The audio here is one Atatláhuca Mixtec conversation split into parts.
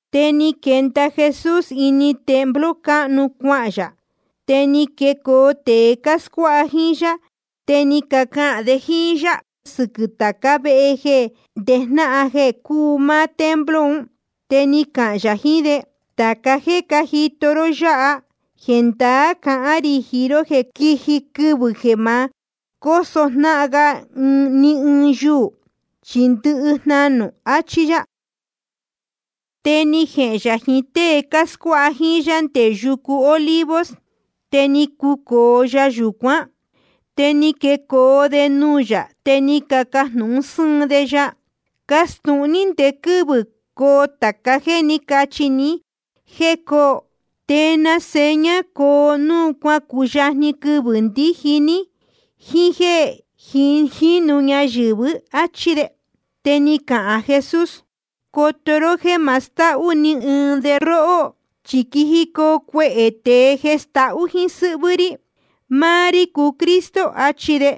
Te ni quenda Jesús ini templo cáhnu cuahān yā. Te ni quecoo tēe cáscuáha jíín yá, te ni cacahān de jíín yá sɨquɨ̄ tācá vehe jeē ndejnáhan jeē cúu máá templo un. Te ni cahān yā jiín de: Tāca jéē cájito ró yáha, jendaá cahán rī jiín ró jeē quiji quɨvɨ̄ jeē ma cóso jnáhan ga ni ɨɨn yuū, chi ndɨhɨ jnanū. Achí yá. Te ni jehēn yā jiín tée cáscuáha jíín yá nde yucu Olivos, te ni cucōo ya yūcuán. Te ni quecoo de nuū yā, te ni cacajnūhun sɨ́ɨn de ya: Castūhun ní ndé quɨ́vɨ̄ coo tāca jéē ní cachi ní jéē coo. ¿Te na seña coo núu ni cuyajni quɨvɨ̄ ndíji ní jíín jéē jínu ñayɨ̄vɨ́? áchí de. Te ni cahān Jesús: Coto ró jéē ma stahú ni ɨɨn de róhó. Chi quijicoo cuehē tēe jeē stahú jíín sɨ́hvɨ́ rí. Máá rí cúu Cristo, achi de.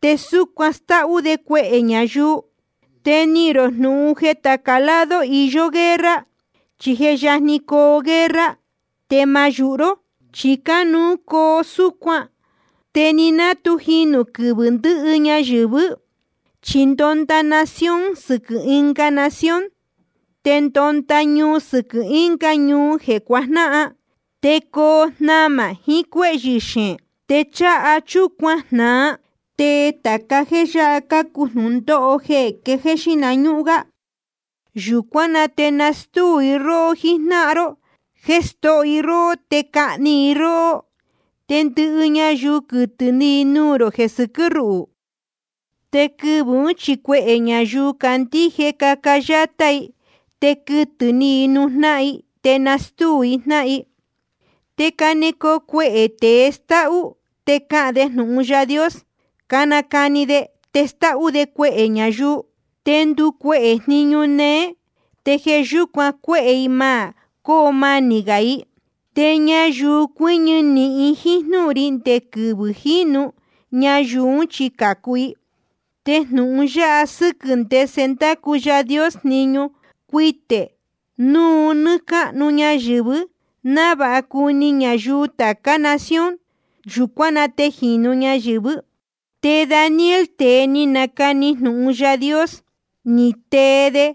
Te súcuan stáhú de cuehē ñayuu. Te nihīn rō jnūhun jeē tāca lado iyó guerra, chí je yajni coo guerra. Te ma yūhu ró, chi cánuú coo súcuan. Te ni ná tu jinū quɨvɨ̄ ndɨhɨ ñayɨ̄vɨ́. Chi ndonda nación sɨquɨ̄ ɨnga nación, te ndonda ñuu sɨquɨ̄ ɨnga ñuu jeē cuajnáhan. Te coo jnamā jiín cuéhyɨ̄ xeēn. Te cháha chúcuan jnāa. Te tāca jéē yáha cácuu jnūndóho quejéé xíhna ñúhún gá. ’Yūcuán na te nastúu i róhó jíjnáhan ró jéē stóho i róhó te cahni i róhó. Te ndɨhɨ ñayuu quɨtɨ̄ ni i nuū rō jeē sɨquɨ́ ruhū. Te quɨvɨ̄ ún chi cuehē ñayuu candíje caca yátá i, te quɨtɨ̄ ni i nuū jnáhan i, te nastúu jnáhan i. Te canecoo cuehē tēe stáhú, te cahān de jeē jnúhun Yaā Dios cánacani de, te stáhú de cuehē ñayuu. Te nducuehē jniñu néé, te jeē yúcuan cuehē i ma cóo manī gā i. Te ñayuu cuɨñɨ nīhin jíín jnúhun ri nde quɨvɨ̄ jínu, ñayuu ún chi cācu. Te jnūhun yáha sɨ́quɨ̄ ndese ndácu Yaā Dios jniñu, cuitē núu nɨ́ɨ́ cáhnu ñayɨ̄vɨ́, návāha cuni ñayuu tācá nación. Yūcuán na te jīnu ñayɨ̄vɨ́. ’Te Daniel, tēe ni nacani jnūhun Yaā Dios, ni tee de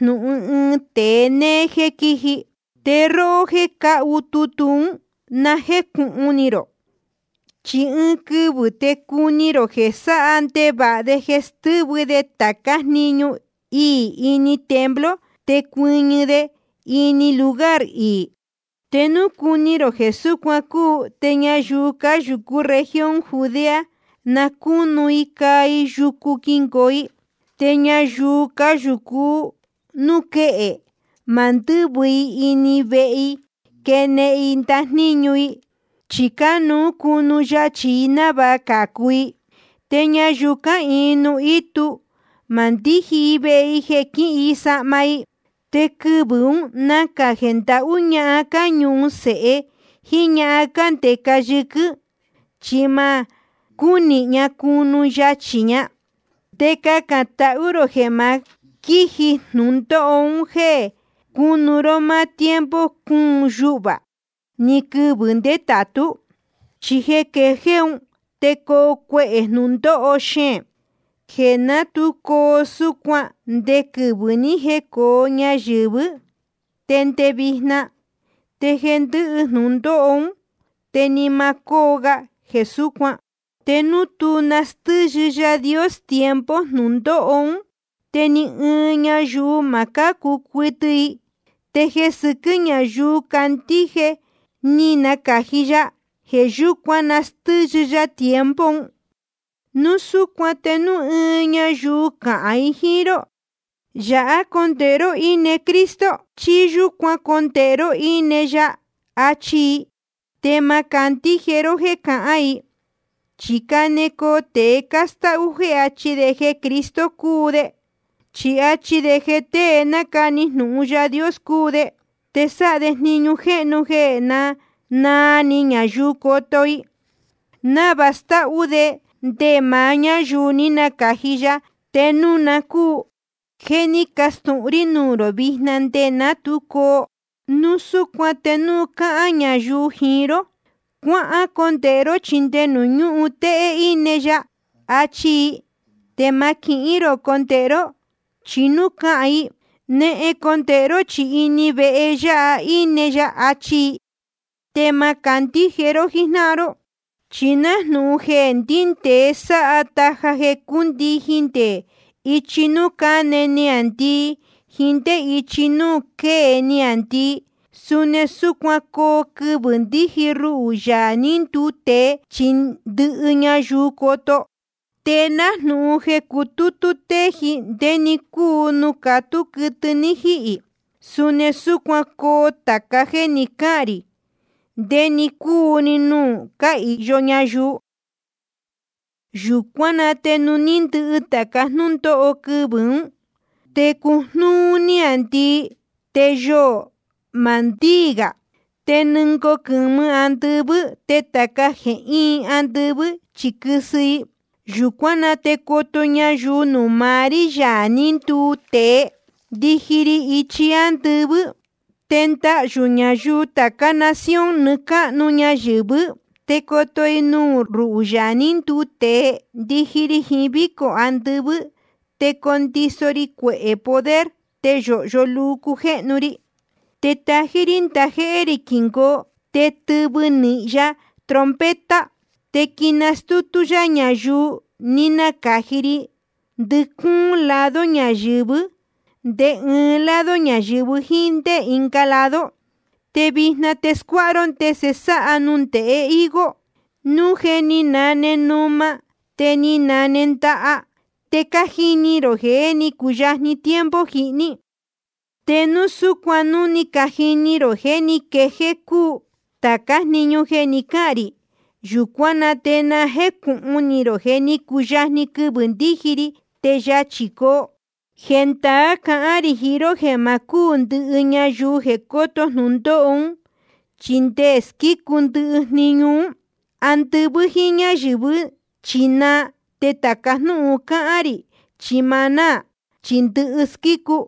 jnūhun ɨɨn tēe néé jéē quíji. Te róhó jéē cácahu tutu ún, na jécūhun ni rō. Chi ɨɨn quɨvɨ̄ te cuni rō jeē sáha ndevāha de jeē stɨ́vɨ de tācá ndajníñu iī ini templo, te cuɨñɨ de ini lugar iī. Te núu cuni rō jeē súcuan cúu, te ñayuu cáyūcú región Judea, na cúnu i caa i yucu quingoo i. Te ñayuu cáyūcu núū quéhe, ma ndɨ́vɨ i ini vehe jeē quénehen i ndajníñu i, chi cánuú cunu yachī i návāha cācu i. Te ñayuu cáhīin nuū ítu, ma ndíji i vehe jeē quíhin i sahma i. Te quɨvɨ̄ ún nacā jeē ndahú ñahan cáñuhun sēhe jíín ñahan cándeca yɨquɨ́n, chi ma cúnihin ña cunu yachī ña. Te cacān tahú rō jeē ma quíji jnūndóho un jéē cunu ró máá tiempo cúun yuhvā ni quɨvɨ̄ ndétātú. Chi jeē quejéé un te coo cuehē jnūndóho xeēn, jeē ná tu coo súcuan nde quɨvɨ̄ ní jecōo ñayɨ̄vɨ́ te nde vijna. Te jeē ndɨ́hɨ jnūndóho ún te ni ma cóo ga jeē súcuan. Te núu tú nastɨ́yɨ Yaā Dios tiempo jnūndóho ún, te ni ɨɨn ñayuu ma cácu cuɨtɨ i. Te jeē sɨquɨ́ ñáyuu cácandíje jeē ní nacāji ya, jeē yúcuan nastɨ́yɨ ya tiempo un. ’Núu súcuan te núu ɨɨn ñayuu cahān jiín ró: Yāhá condēhe ró íne Cristo, chí: Yūcuán condēhe ró íne ya, achi i, te ma candíje ró jéē cahán i. Chi canecoo tēe cástáhú jéē achi de jeē Cristo cúu de, chí achi de jeē tée nácani jnūhun Yaā Dios cúu de. Te sáha de jniñu jéhnu jeē naa ni ñayuu coto i, návāha stáhú de nde maá ñáyuu ní nacāji ya, te núu na cúu. Je ni castūhun rí nuū rō vijna nde ná tu coo. Núu súcuan te núu cahān ñayuu jiín ró: Cuácondēhe ró, chi nde nuū ñúhun téhé íne ya, achi i, te ma quihín rō condēhe ró. Chí núu cahān i: Nehen condēhe ró, chi ini vehe yāha íne ya, achi i, te ma candíje ró jíjnáhan ró. Chi nájnūhun jeē ndíndēe sáha taja te cúndijin nde ichi núū cáne niāndii jíín ndé ichi núū quée niāndii, suni súcuan coo quɨvɨ̄ ndiji ruhū, Yaā ní nduu tēe, chi ndɨhɨ ñayuu coto. Te nájnūhun jeē cutútú téji ndé‑ni cúu nuū catú quɨtɨ ní jíhī, suni súcuan coo tāca jéē ni cáhān rī ndé‑ni cúu‑ni nuū cáhīyo ñayuu. ’Yūcuán na te núu ni ndɨhɨ tāca jnúndóho quɨvɨ̄ ún, te cojnúú níāndii, te yoō ma ndíī gā. Te nɨngoo quɨ̄mɨ andɨvɨ́. Te tāca jéē íin andɨvɨ́ chi quɨsɨ i. Yūcuán na te coto ñayuu nuū maá rí, Yaā ní nduu tēe, ndiji ri ichi ándɨvɨ́. Te ndahyū ñayuu tācá nación nɨɨ́ cáhnu ñayɨ̄vɨ́. Te coto i nuū ruhū, Yaā ní nduu tēe, ndiji ri jiín vícō andɨvɨ́, te condiso ri cuehē poder, te yōhyo luu cujéhnu ri. Te tají rí ndajéhé rī quingoo, te tɨvɨ nīhin ya trompeta. Te quinastútú yá ñayuu ní nacāji ri ndɨcúún lado ñayɨ̄vɨ́, nde ɨɨn lado ñayɨ̄vɨ jíín ndé ɨnga lado. ’Vijna te scuáha ró ndese sáha nundēhe higo: Núu je ni nane numa, te ni najee ndaha, te cájini rō jeē jé ni cuyajni tiempo jihní. Te suni súcuan núu ni cajini rō jeē ní quejéé cúu tācá jniñu jeē ni cáhān rī, yūcuán na te na jécūhun ni rō jeē ní cuyajni quɨvɨ̄ ndiji ri, te yachī coo. Jendaá cahán rī jiín ró jeē ma cúū ndɨhɨ ñayuu jeē cóto jnūndóho ún, chi nde squícu ndɨhɨ jniñu ún. Andɨvɨ́ jíín ñáyɨ̄vɨ́ chi naa, te tāca jnúhun cáhán rī chi ma náā, chi ndɨhɨ squícu.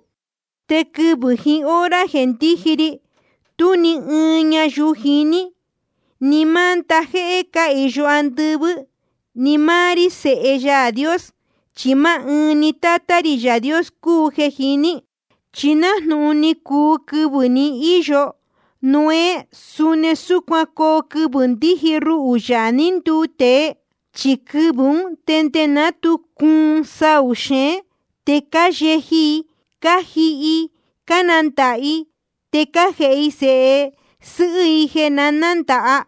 ’Te quɨvɨ̄ jiín hora jeē ndíji ri, tú ni ɨɨn ñayuu jiní, ni máá ndajéhé cáhīyo andɨvɨ́, ni máá rí, Sēhe Yaā Dios. Chi máá ɨɨn ni Tátá rī Yaā Dios cúu jeē jiní. ’Chi nájnūhun ni cuu quɨvɨ̄ ni íyo Noé, suni súcuan coo quɨvɨ̄ ndiji ruhū, Yaā ní nduu tēe. Chi quɨvɨ̄ ún, nde ná tu cuun saū xeén, te cáyeji i cájihi i, cánandāha i, te cájēhe i sēhe sɨ́hɨ́ i jeē nándāha,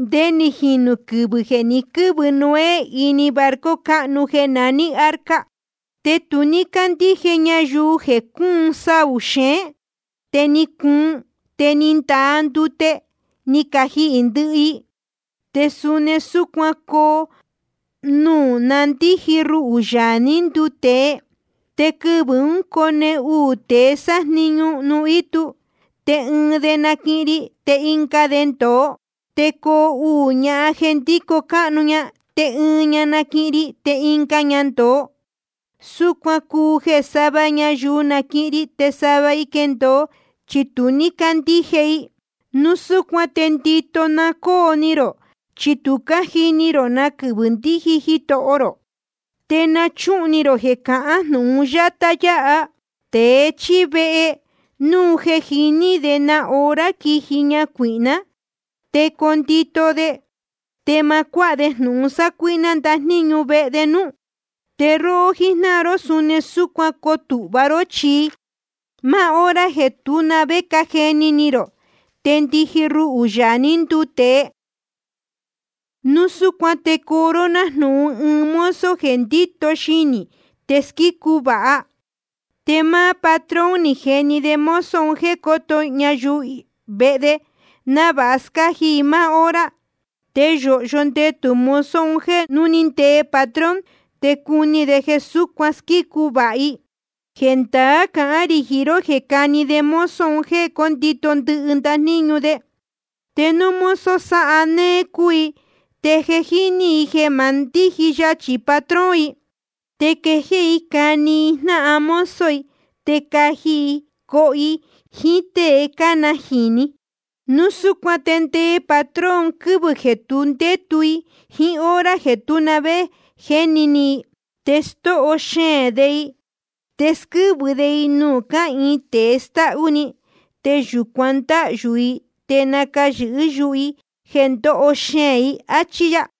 nde ni jinū quɨvɨ̄ jeē ni quɨ́vɨ Noé ini barco cáhnu jeē naní arca. Te tu ní cácandíje ñayuu jeē cuun saū xeén, te ni cuun, te ni ndaa ndute ni cajihī ndɨhɨ i. Te suni súcuan coo núu na ndíji ruhū, Yaā ní nduu tēe. Te quɨvɨ̄ ún cone uū tēe sájniñu nuū ítu. Te ɨɨn de naquihin ri, te ɨnga de ndōo. Te coo uū ñahan jeē ndíco cáhnu, te ɨɨn ña naquihin ri, te ɨnga ña ndōo. Súcuan cuu jeē sava ñayuu naquihin ri te sava i quendōo, chi tu ní cácandíje i. ’Núu súcuan te ndito na cóo ni rō, chi tu cájini rō na quɨvɨ̄ ndiji Jitoho rō. Te na chúhun ni rō jeē cahán jnūhun yátá yáha: Tēe chíí vehe, núu jeē jiní de na hora quiji ñacuīhná, te condito de, te ma cuáha de jnūhun sácuíhná ndajníñu vehe de núú. Te róhó jíjnáhan ró, suni súcuan coo tūhva ró, chi máá hora jeē tú na vé cájeni ni rō, te ndiji ruhū, Yaā ní nduu tēe. ’Núu súcuan te coo ró nájnūhun ɨɨn mozo jeē ndíto xinī te squícu vāha. Te máá patrón ni jeni de mozo un jéē cóto i ñayuu vehe de, návāha scáji i máá hora. Te yōhyo ndetū mozo un jéē núu ni ndee patrón, te cuni de jeē súcuan squícu vāha i. Jendaá cahán rī jiín ró jeē cani de mozo un jéē cóto i ndɨhɨ ndajníñu de. Te núu mozo sáha néé cúu i, te jéni ni i jeē ma ndíji yachī patrón i, te quejéé i cani i jnáhan mozo i, te caji i coho i jíín tée cánajīni, núu súcuan te ndee‑ni patrón quɨvɨ̄ jeē tu ndétu i jíín hora jeē tú na vé jéni ni i. Te stóho xeēn de i, te squɨ́vɨ de i nuū cáhīin tēe stáhú‑ni. Te yūcuan ndáhyū i te nacayɨ̄hɨ́ yuhu i jeē ndoho xeēn i. Achí yá.